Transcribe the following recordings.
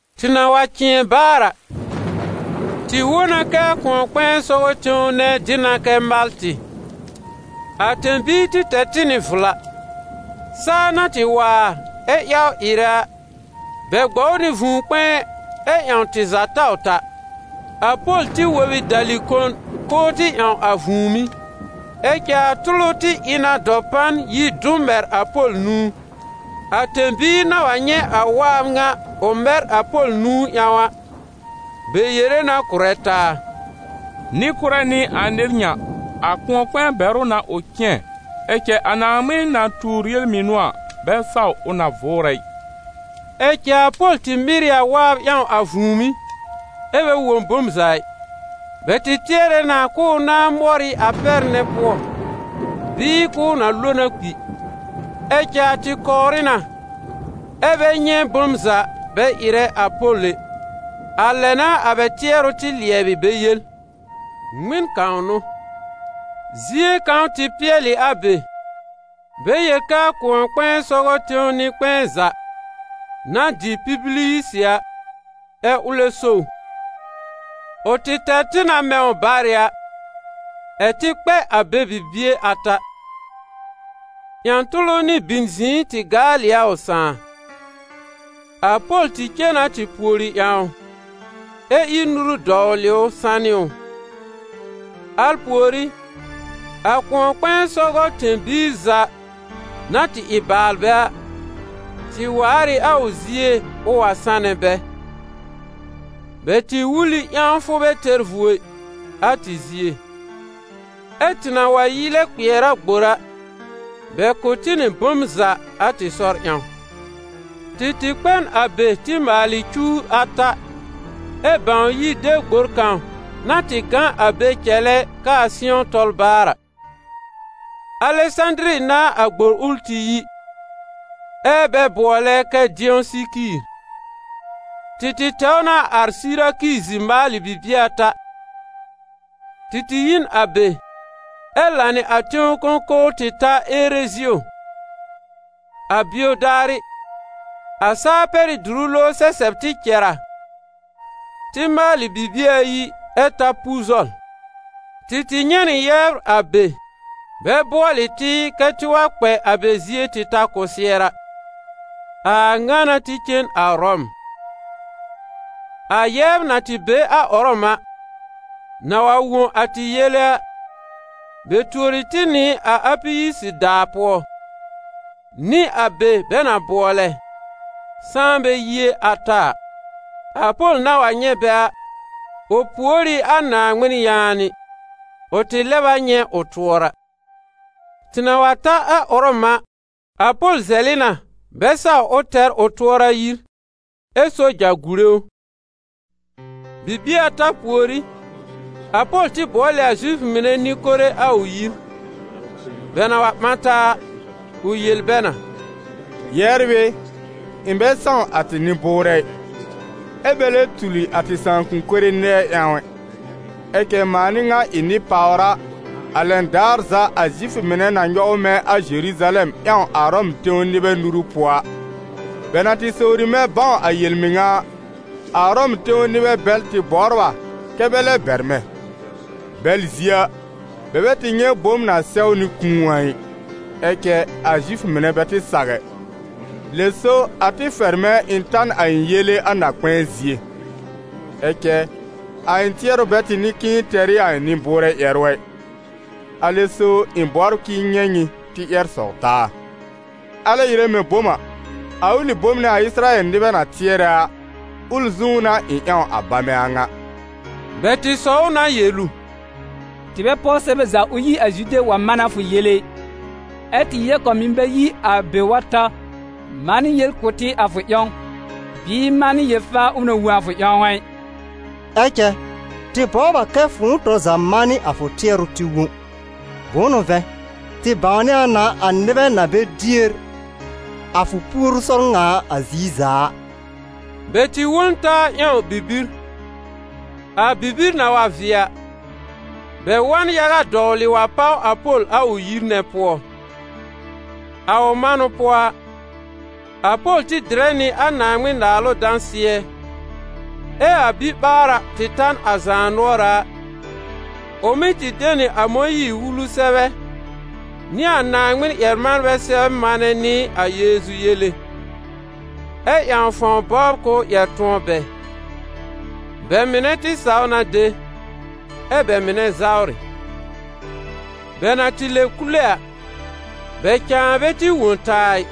Tɩ na wa cɩ̃ɛ baar a, tɩ wõ na kɛ a kʋ̃ɔ-kpɛ̃ɛ sɔgɔ tẽw nɛ dɩ na kɛ Maltɩ. A tẽ-biir tɩ tɛr tɩ nɩ vla. Saa na tɩ waar ɛ yawr ɩrɛ a, bɛ gbɔw nɩ vũu-kpɛ̃ɛ ɛ ƴãw tɩ za taw ta. A Pol tɩ wob ɩ dali-kon k'ʋʋ tɩ ƴãw a vũùmí. Ɛ cɛ a tʋlʋ tɩ ɩ na dɔpan yi dʋ̃ mɛr a Pol nũu. A tẽ-biir na wa nyɛ̃ a waab ŋa ʋ mɛr a Pol nũu ƴãw a, bɛ yere na kʋ̀rɛ taa: «Nɩ-kʋ́rɛ n'ɩ a nɩr ŋa, a kʋ̃ɔ-kpɛ̃ɛ bɛr ʋ na ʋ cɩ̃ɛ, ɛ cɛ a Naaŋmɩn na tuur yel-mɩnʋ a, bɛ saw ʋ na vʋʋrɛ ɩ.» Ɛ cɛ a Pol tɩ mɩr ɩ a waab ƴãw a vũùmí ɛ́ bɛ wõ bom za ɩ. Bɛl tɩ tɩɛrɛ na k'ʋʋ na mɔr ɩ a pɛr nɛ pʋɔ, bɩɩ k'ʋʋ na lo na kpi. Ɛ cɛ a tɩ kɔwrɩ na, ɛ bɛ nyɛ̃ bom za bɛ ɩrɛ a Pol ɛ. A lɛ n'a a bɛ tɩɛrʋ tɩ lɩɛbɩ bɛ yel: «Ŋmɩn kãw n'ʋ!» Zie kãw tɩ pɩɛlɩ a be, bɛ yel kɛ a kʋ̃ɔ-kpɛ̃ɛ sɔgɔ tẽw nɩ-kpɛ̃ɛ za, na dɩ Pibiliyisɩ a, ɛ ʋlɛ so ʋ. Ʋ tɩ tɛr tɩ na mɛ̃ ʋ barɩ a, ɛ̀ tɩ kpɛ a be bibie ata. Ƴã-tʋlʋ nɩ bin-zɩ̃ɩ tɩ gaal ɩ a ʋ sãà. A Pol tɩ cen na tɩ pùori ƴãw ʋ, ɛ ír nuru dɔwlɩ ʋ sanɩ ʋ. Al pùorí, a kʋ̃ɔ-kpɛ̃ɛ sɔgɔ tẽ-biir za na tɩ ɩ baalbɛ a, tɩ waar ɩ a ʋ zie ʋ wa sanɛ bɛ. Bɛ tɩ wul ɩ ƴãwfʋ bɛ tɛr vuo ɩ, a tɩ zie. Ɛ tɩ na wa yi lɛ kpɩɛr a gbor a, bɛ kʋ̀ tɩ nɩ bom za a tɩ sɔr ƴãw. Tɩ tɩ kpɛ n a be tɩ maalɩ cuwr ata, ɛ bãw yi de gbor kãw na tɩ gã a be cɛlɛ kɛ a sɩ̃ɔ tɔl baar a. Alɛsãdiri n'a a gbor ʋl tɩ yi, ɛ́ bɛ bʋɔlɛ kɛ Dɩɔsɩkiir. Tɩ tɩ tɛw na ar Sɩrakizi maalɩ bibie ata. Tɩ tɩ yi n a be, ɛ lanɩ a tẽw kõkowr tɩ ta Erezio. A bio daarɩ, a saa-pɛrɩ́-dʋrʋ-lowr sɛsɛb tɩ cɛr a, tɩ maalɩ bibie ayi ɛ ta Puzɔl. Tɩ tɩ nyɛ̃ nɩ yɛbr a be, bɛ bʋɔlɩ tɩ kɛ́ tɩ wa kpɛ a bɛ zie tɩ ta kɔsɩɛra. A a ŋa n'a tɩ cen a Ʋrɔm. A yɛbr na tɩ be a Ʋrɔm a, na wa wõ a tɩ yele a, bɛ tuori tɩ nɩ a Apiyisi-daa pʋɔ, nɩ a be bɛ na bʋɔlɛ: Sãanbɛ-yie-ata a. A Pol na wa nyɛ̃ bɛ a, ʋ pùor ɩ a Naaŋmɩn yaanɩ. Ʋ tɩ lɛb a nyɛ̃ ʋ tʋɔra. Tɩ na wa ta a Ʋrɔm a, a Pol zɛlɩ na bɛ saw ʋ tɛr ʋ tʋɔra yir, ɛ́ soja gùre ʋ. Bibie ata pùorí, a Pol tɩ bʋɔl ɩ a Zifʋ mɩnɛ nɩ-kore a ʋ yir. Bɛ na wa ɓã taa a, ʋ yel bɛ na: «Yɛbr ɩ, ɩ̃ bɛ sãw a tɩ nɩ-bʋʋrɛ ɩ, ɛ́ bɛ lɛ tuli a tɩ sãakʋm mɩnɛ nɛɛ ƴãw ɛ, ɛ cɛ mãa n'ɩ ŋa ɩ nɩ-pàwra, a lɛn daar za a Zifʋ mɩnɛ na nyɔw mɛ̃ a Zeruzalɛm ƴãw a Ʋrɔm tẽw nɩbɛ nuru pʋɔ a. Bɛ na tɩ sowri mɛ̃ bãw a yel-mɩŋa a, a Ʋrɔm tẽw nɩbɛ bɛl tɩ bɔbr a kɛ́ bɛ lɛb bɛr mɛ̃. Bɛl zie a, bɛ bɛ tɩ nyɛ̃ bom na sɛwnɩ kũu a ɩ. Ɛ cɛ, a Zifʋ mɩnɛ bɛ tɩ saw ɛ. Lɛ so a tɩ fɛr mɛ̃ ɩ̃ ta n a ɩ̃ yele a na-kpɛ̃ɛ zie. Ɛ cɛ a ɩ̃ tɩɛrʋ bɛ tɩ n'ɩ k'ɩ̃ɩ tɛr ɩ a ɩ̃ nɩ-bʋʋrɛ ƴɛrʋ ɛ. Alɛ so ɩ̃ bɔbr k'ɩ̃ɩ nyɛ̃ nyɩ tɩ ƴɛr sɔw taa. Alɛ ɩrɛ mɛ̃ bom a, a ʋlɩ bom nɛ a Ɩsɩrayɛl nɩbɛ na tɩɛrɛ a, ʋl zũú n'a ɩ̃ ƴãw a bamɛ a ŋa.» Bɛ tɩ sɔw na yel ʋ: «Tɩ bɛ páw sɛbɛ za ʋ yi a Zude wa manɛ a fʋ yele ɩ, ɛ́ tɩ yɛb kãw mɩ̀ bɛ yi a be wa ta manɩ yel kʋ̀ tɩ a fʋ ƴãw, bɩɩ manɩ yel-faa ʋ na wõ a fʋ ƴãw a ɩ. Ɛ cɛ tɩ bɔbr a kɛ fʋ̃ʋ tɔr za manɩ a fʋ tɩɛrʋ tɩ wõ. Bʋ̃ʋ n'ʋ vɛ̃, tɩ bãwnɩ a na a nɩbɛ na bɛ dier a fʋ puoru sɔr ŋa a ziir za a.» Bɛ tɩ wõ n taa ƴãw bibir. A bibir na wa vɩɛ a, bɛ wa n yaga dɔwlɩ wa páw a Pol a ʋ yir nɛ pʋɔ. A ʋ manʋ pʋɔ a, a Pol tɩ dɩrɛ nɩ a Naaŋmɩn-Naalʋ dãsɩɛ, ɛ a biɓaara tɩ ta n a zaanʋɔra a, ʋ mɩ́ tɩ de nɩ a Mõyiir-Wulu sɛbɛ nɩ a Naaŋmɩn-ƴɛr-manbɛ sɛbr manɛ nɩ a Yeezu yele, ɛ ƴãw fãw bɔbr k'ʋʋ ƴɛr tʋ̃ɔ bɛ. Bɛ mɩnɛ tɩ saw na de, ɛ bɛ mɩnɛ zawrɩ. Bɛ na tɩ lɛb kule a, bɛ cãa bɛ tɩ wõ taa a ɩ.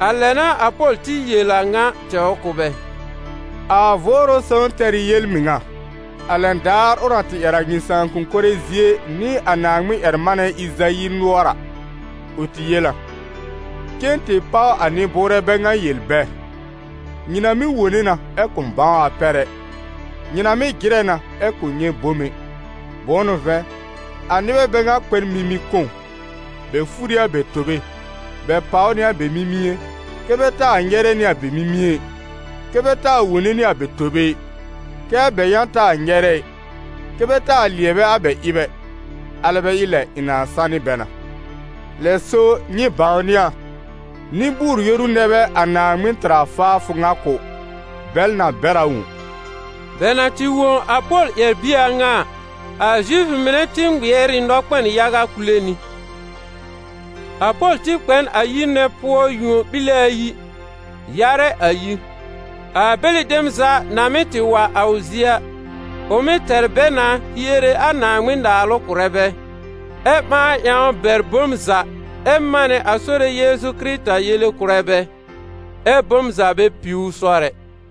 A lɛ n'a a Pol tɩ yel a ŋa tɛwr kʋ̀ bɛ: «A Vʋʋrʋ Sõw tɛr ɩ yel-mɩŋa, a lɛn daar ʋ na tɩ ƴɛr a nyɩ sãakʋm mɩnɛ zie nɩ a Naaŋmɩn-ƴɛr-manɛ Ɩzayi nʋɔr a. Ʋ tɩ yel a: ‹Cen tɩ páw a nɩ-bʋʋrɛ bɛ ŋa yel bɛ: nyɩ na mɩ́ wone na ɛ kʋ̃ bãw a pɛr ɛ. Nyɩ na mɩ́ jɩrɛ na ɛ kʋ̃ nyɛ̃ bom ɛ. Bʋ̃ʋ n'ʋ vɛ̃, a nɩbɛ bɛ ŋa kpɛ n mimi-kõw; bɛ fur ɩ a bɛ tobe, bɛ pàw nɩ a bɛ mimie kɛ́ bɛ taa nyɛrɛ nɩ a bɛ mimie ɩ, kɛ́ bɛ taa wone nɩ a bɛ tobe ɩ, kɛ́ a bɛ yã taa nyɛrɛ ɩ, kɛ́ bɛ taa lɩɛbɛ a bɛ ɩb ɛ, alɛ bɛ ɩ lɛ ɩ̃ nãa sanɩ bɛ na.› Lɛ so nyɩ bãwnɩ a, nɩ-bʋʋr-yoru nɛ bɛ a Naaŋmɩn tɩr a faafʋ ŋa kʋ̀. Bɛl na bɛr a wõ.» [ Bɛ na tɩ wõ a Pol ƴɛr-bie a ŋa a, a Zifʋ mɩnɛ tɩ ŋmɩɛr ɩ nɔkpɛn yaga kule nɩ.] A Pol tɩ kpɛ n a yir nɛ pʋɔ yũo-ɓile ayi, yarɛ a yir. A bɛlɩ dem za na mɩ́ tɩ wa a ʋ zie a, ʋ mɩ́ tɛr bɛ na hiere a Naaŋmɩn-Naalʋ kʋ̀rɛ bɛ, ɛ́ ɓãa ƴãw bɛr bom za ɛ manɛ a Sore Yeezu Kɩrɩta yele kʋ̀rɛ bɛ, ɛ́ bom za bɛ piw ʋ sɔr ɛ.